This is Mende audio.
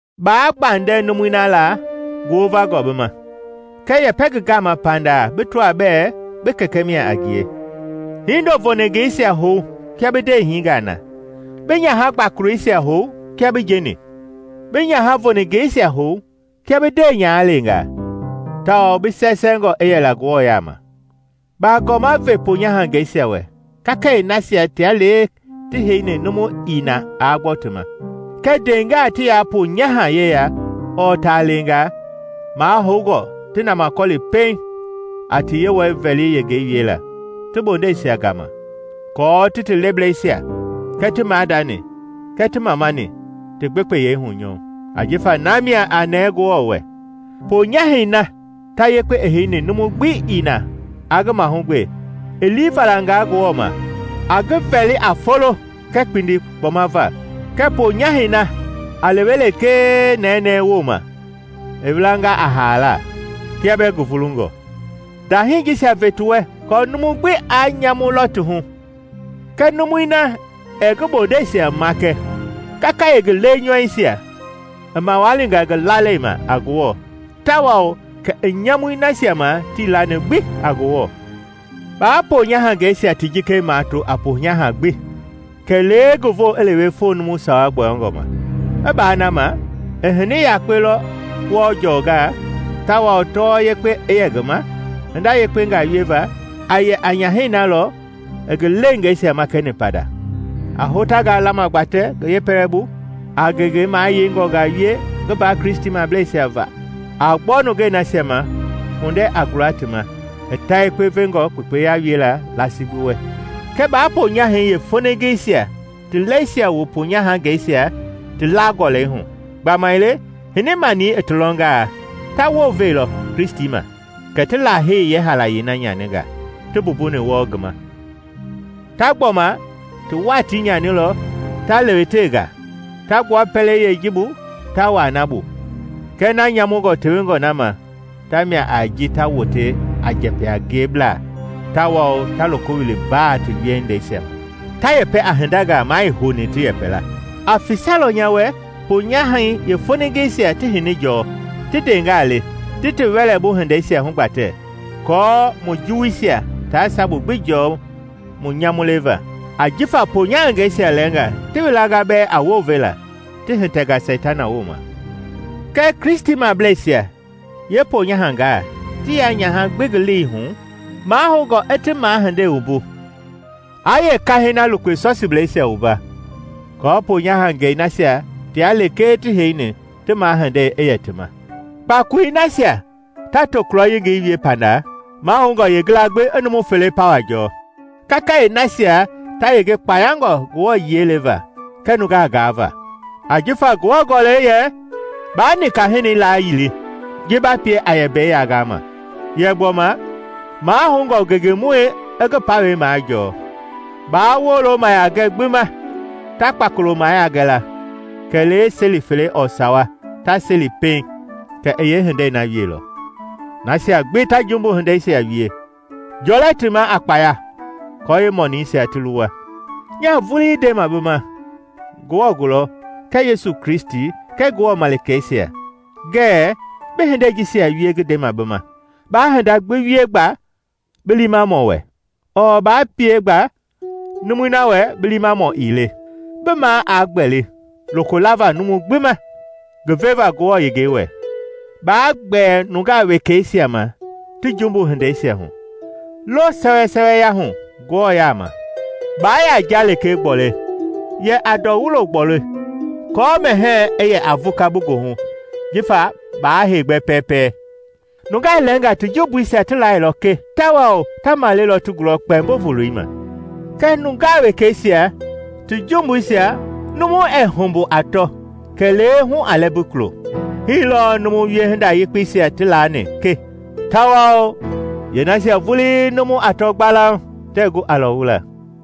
Baa gbandɛ numui na la ngi wovangɔ bi ma, kɛɛ yɛpɛ ngi gama pandaa bi tɔa bɛɛ bi kɛkɛ mia a ngie. Hindo voningeisia hou kia bi ndeehingaa na, bi nyaha gbakoloisia hou kia bi njeni, bi nyaha voningeisia hou kia bi ndeenyahaleengaa, tawao bi sɛɛsɛɛngɔ i yɛla Ngewɔ yaama. Baagɔma ve ponyahangɛisia wɛ kakayee nasia tia lekee ti heini numu ii na aa gbɔ ti ma. Kɛɛ ndeengaa ti yaa ponyaha yeya ɔɔ taaleengaa, mahoungɔ ti namakɔli pɛiŋ a ti Yewɔi-vɛli yengei wiela ti bondɛisia gama aako ti ti leblɛisia kɛɛ ti maadani kɛɛ ti mamani ti gbekpeyɛi hunyɔɔ, ajifa na mia a nɛɛ Ngewɔ wɛ. Ponyahɛi na ta yakpe i heini numu gbi ii na aa ngi mahugbe, i lii valanga Ngewɔ ma, a ngi vɛli a folo kɛɛ kpindi kpɔma va. Kɛɛ ponyahɛi na a lewe lekee nɛnɛɛ wooma, i welanga a haala, kia bɛɛ ngi vulungɔ. Ndahii jisia ve ti wɛ kɔɔ numu gbi aa nyamu lɔ ti hu. Kɛɛ numui na ɛɛ ngi bondɛisia makɛ kakayee ngi lenyɔuisia, i mawalinga ngi lalei ma a Ngewɔ tawao kɛ i nyamuni nasia ma tii lani gbi a Ngewɔ. Baa ponyahangɛisia ti jikei mato a ponyaha gbi kɛlee ngi voo i lewe foo numu sawa gbɔyɔngɔ ma. I baa na ma, i hini yakpe lɔ wɔɔ jɔnga, tawao tɔwɔ yekpe i yɛ ngi ma hinda yekpengaa wieva, a yɛ a nyahɛi na lɔ i ngi leengeisia makɛni pandaa, a hotangaa lama gbatɛ ngi yeepɛlɛbu, a ngenge mayeingɔngaa wie ngi mbaa Kristimableisia va, a gbɔ nungei nasia ma kpundɛ a gula ti ma, i ta yekpe vengɔ kpekpeya wiela laasi gbi wɛ. Kɛɛ baa ponyahɛi yeefoningeisia ti lɛisia wu ponyahangɛisia ti la-gɔlɛi hu; gbamaile hini-mani i ti lɔnga ta wounvelɔ Kristi ma, kɛ ti Lahei yeehaalayei na nyaninga ti mbumbuni wɔɔ ngi gama. Ta gbɔma ti watii nyaanilɔ ta lewetewe nga, ta gbua pɛlei yeeji bu ta wuaa na bu; kɛɛ na nyamungɔ tewengɔ na ma ta mia a ji ta wote a njɛpɛ-a-ngieblaa tawao ta loko wili mbaa ti hindeisia hu, ta yɛpɛ a hindangaa maa ii houni ti yɛpɛ la. A fisalɔ nya wɛ ponyahɛi yeefoningeisia ti hini jɔɔ, ti ndeengaa le, ti ti wɛlɛbu hindeisia hugbatɛ, kɔɔ mu juwuisia taa sabu gbi jɔɔ mu nyamu leva. Ajifa ponyahangɛisia lɛɛngaa ti welanga bɛɛ a wounvela ti hitɛnga Seitana wooma. Kɛɛ Kristimableisia yeeponyahangaa ti yaa nyaha gbi ngi lei hu, mahoungɔ i ti mahindei wumbu, aa yeekahɛi na lukpe sɔsiblɛisia wumba, kɔɔ ponyahangɛi nasia tia lekee ti heini ti mahindei i yɛ ti ma. Kpakoloi nasia ta tokulɔ yengei wie pandaa, mahoungɔ yeengila gbi i numu fele pawa jɔɔ, kakayee nasia ta yenge kpayangɔ Ngewɔ yiɛi leva kɛɛ nungaa gaava. Ajifa Ngewɔ Gɔlɛi yɛ, “Baa nika-hinɛi layili ji ba pie a yɛ mbei yangama”; yɛ gbɔma, “Mahoungɔ ngengemɔi i ngi pawɛi majɔɔ.” Baa wolo mayiagɛ gbi ma ta kpakolo mayia gɛ la, kɛlee seli fele ɔɔ sawa ta seli pɛiŋ kɛ i yeehindei na wieilɔ. Nasia gbi ta jumbu hindeisia wie, jɔlɛ ti ma a kpaya kɔɔ yeemɔniisia ti luwa. Nyaa vulii ndema bi ma Ngewɔ gulɔ kɛɛ Yesu Kristi kɛɛ Ngewɔ malikeisia ngɛɛ bi hindei jisia wie ngi ndema bi ma, baa hinda gbi wie gba bi liimamɔ wɛ, ɔɔ ba pie gba numui na wɛ bi liimamɔ ii le. Bi maa aa gbɛli loko lava numu gbi ma ngi veva Ngewɔ yengei wɛ. Baa gbɛɛ nungaa wekɛisia ma ti jumbu hindeisia hu; loo sɛwɛsɛwɛya hu Ngewɔ yaama. Baa yaa nja lekee gbɔle; yɛ a ndɔ wulo gbɔle aako mɛhɛɛ i yɛ a vuka bi goohu jifa ba heegbɛ pɛɛpɛ. Nungaa lɛɛnga ti jumbuisia ti lailɔ kɛ, tawao ta maleilɔ ti gulɔ kpɛmbo voloi ma; kɛɛ nungaa wekɛisia ti jumbuisia numu ɛɛ humbu a tɔ kɛlee hu a lɛmbi kulo. Hii lɔɔ numu wiehinda yekpeisia ti laani ke tawao yeenasia vulii numu ɛɛ tɔ gbalauŋ tɛɛ gu a lɔwula.